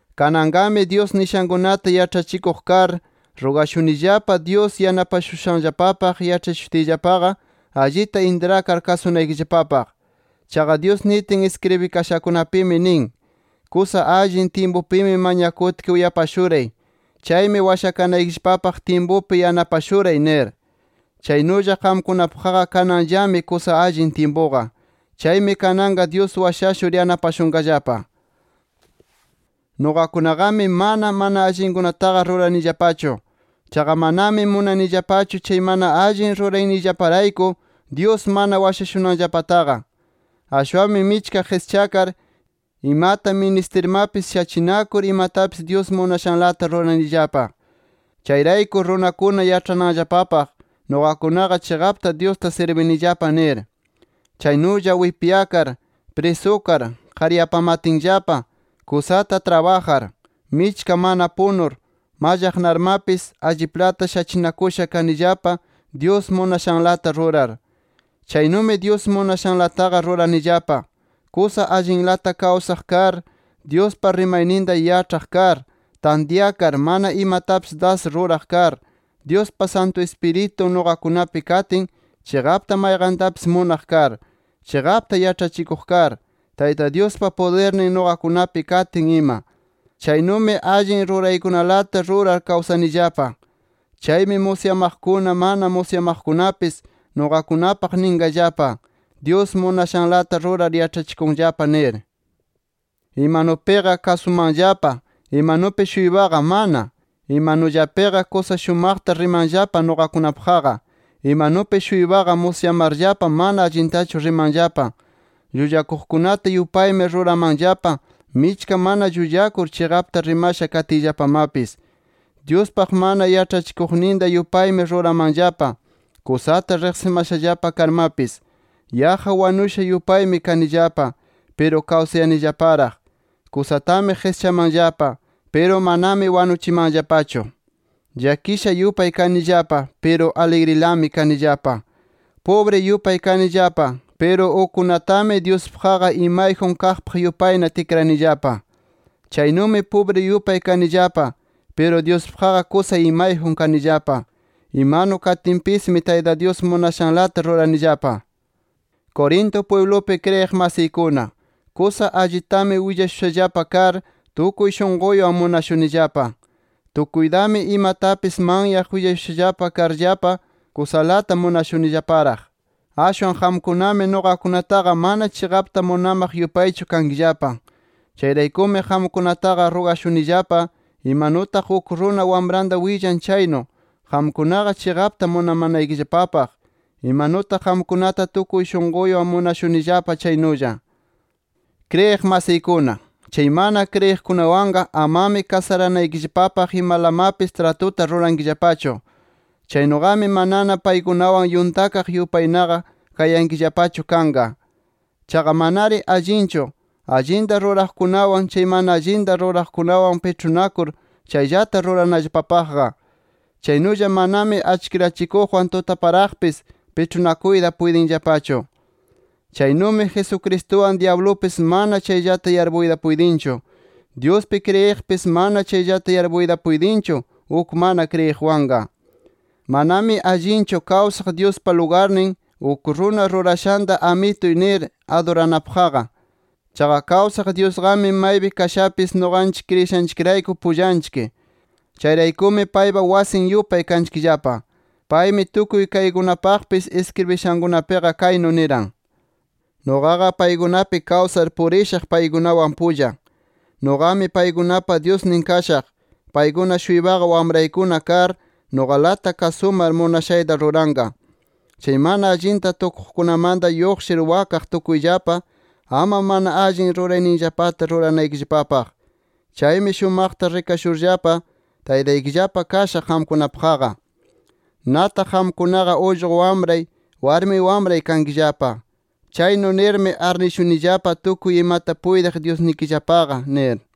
Kananqami, Dyus nishankunata yaĉhachikuq kar, rugashunillapa Dyus yanapashushanllapapaq yaĉhachishutinllapaqa, allita intrakar kasunaykillapapaq. Chaqa Dyus nitin iskribikashakunapimi nin: “Kusa allin tyimpupi mañakutki uyapashuray. Chaymi washakanaykillapapaq tyimpupi yanapashuray” nir. Chaynulla qamkunapaqqa kananllami kusa allin tyimpuqa. ¡Chaymi kananqa Dyus washashur yanapashunqallapa! Nuqakunaqami mana, mana allinkunataqa ruranillapachu. Chaqa manami munanillapachu chay mana allin rurayniyllaparayku, Dyus mana washashunanllapataqa. Ashwanmi michka qischakar, imata ministirmapis, shachinakur imatapis Dyus munashanlata ruranillapa. Chayrayku runakuna yaĉhananllapapaq, nuqakunaqa chiqapta Dyusta sirbinillapa nir. Chaynulla wipyakar, prisukar, qaryapamatinllapa, kusata trabajar, michka mana punur, mallaqnarmapis, alliplata shachinakusha kanillapa, Dyus munashanlata rurar. Chaynumi Dyus munashanlataqa ruranillapa: Kusa allinlata kawsaq kar, Dyuspa rimayninta yaĉhaq kar, tantyakar mana imatapis das ruraq kar, Dyuspa Santu Ispiritun nuqakunapi katin chiqapta mayqantapis munaq kar, chiqapta yaĉhachikuq kar, Tayta Dyuspa pudirnin nuqakunapi katin ima. Chaynumi allin ruraykunalata rurar kawsanillapa. Chaymi musyamaqkuna, mana musyamaqkunapis nuqakunapaq ninqallapa, Dyus munashanlata rurar yaĉhachikunllapa nir. Imanupiqa kasumanllapa. Imanupi-shuypaqa mana. Imanullapiqa kusa shumaqta rimanllapa nuqakunapaqqa. Imanupi-shuypaqa musyamarllapa mana allintachu rimanllapa. Llullakuqkunata yupaymi ruramanllapa, michka mana llullakur, chiqapta rimasha katiyllapamapis. Dyuspaq mana yaĉhachikuqninta yupaymi ruramanllapa, kusata riqsimaqllapa karmapis. Yaqqa wanusha yupaymi kanillapa, piru kawsayanillaparaq. Kusatami qischamanllapa, piru manami wanuchimanllapachu. Llakisha yupay kanillapa, piru aligrilami kanillapa. Pubri yupay kanillapa, piru ukkunatami Dyuspaqqa imayjun kaqpaq yupayna tikranillapa. Chaynumi pubri yupay kanillapa, piru Dyuspaqqa kusa imayjun kanillapa. Imanu katinpismi, Tayta Dyus munashanlata ruranillapa. Corinto pwiblupi kriyiq masiykuna, kusa allitami willashushallapa kar, tukuy shunquywan munashunillapa. Tukuytami imatapis manyaq willashusha karllapa kusalata munashunillaparaq. Ashwan qamkunami nuqakunataqa mana chiqapta munamaq yupaychu kankillapa. Chayraykumi qamkunataqa rugashunillapa, imanutaq uk runa wamranta willan chaynu, qamkunaqa chiqapta munamanaykillapapaq, imanutaq qamkunata tukuy shunquywan munashunillapa chaynulla. Kriyiq masiykuna, chay mana kriyiqkunawanqa amami kasaranaykillapapaq imalamapis tratuta rurankillapachu. Chaynuqami manana paykunawan yuntakaq yupaynaqa kayankillapachu kanqa. Chaqa manari allinchu, allinta ruraqkunawan, chay mana allinta ruraqkunaqa piĉhunakur chayllata yarpunanllapapaqqa. Chaynulla manami achkirachikuqwan tutaparaqpis piĉhunakuyta puytinllapachu. Chaynumi Jesucristuwan, dyablupis mana chayllata yarpuyta puytinchu. Dyuspi kriyiqpis, mana chayllata yarpuyta puytinchu, uk mana kriyiqwanqa. Manami allinchu kawsaq Dyuspa lugarnin, uk runa rurashanta amituy nir aduranapaqqa. Chaqa kawsaq Dyusqami maypi kashapis, nuqanchik kriyishanchikrayku pullanchik. Chayraykumi paypa wasin yupay kanchikllapa. Paymi tukuy kaykunapaqpis iskribishankunapiqa kaynu niran: “Nuqaqa paykunapi kawsar purishaq paykunawan pulla. Nuqami paykunapa Dyusnin kashaq. Paykuna-shuypaqa wamraykuna kar, nuqalata kasumar munashayta ruranqa. Chay mana allinta tukuqkunamanta lluqshir wakaq tukuyllapa, ama mana allin rurayninllapata ruranaykillapapaq. Chaymi shumaqta rikashurllapa, Taytaykillapa kashaq qamkunapaqqa. Nataq qamkunaqa ullqu wamray, warmi wamray kankillapa. Chaynu nirmi arnishunillapa tukuy imata puytiq Dyusnikillapaqa” nir.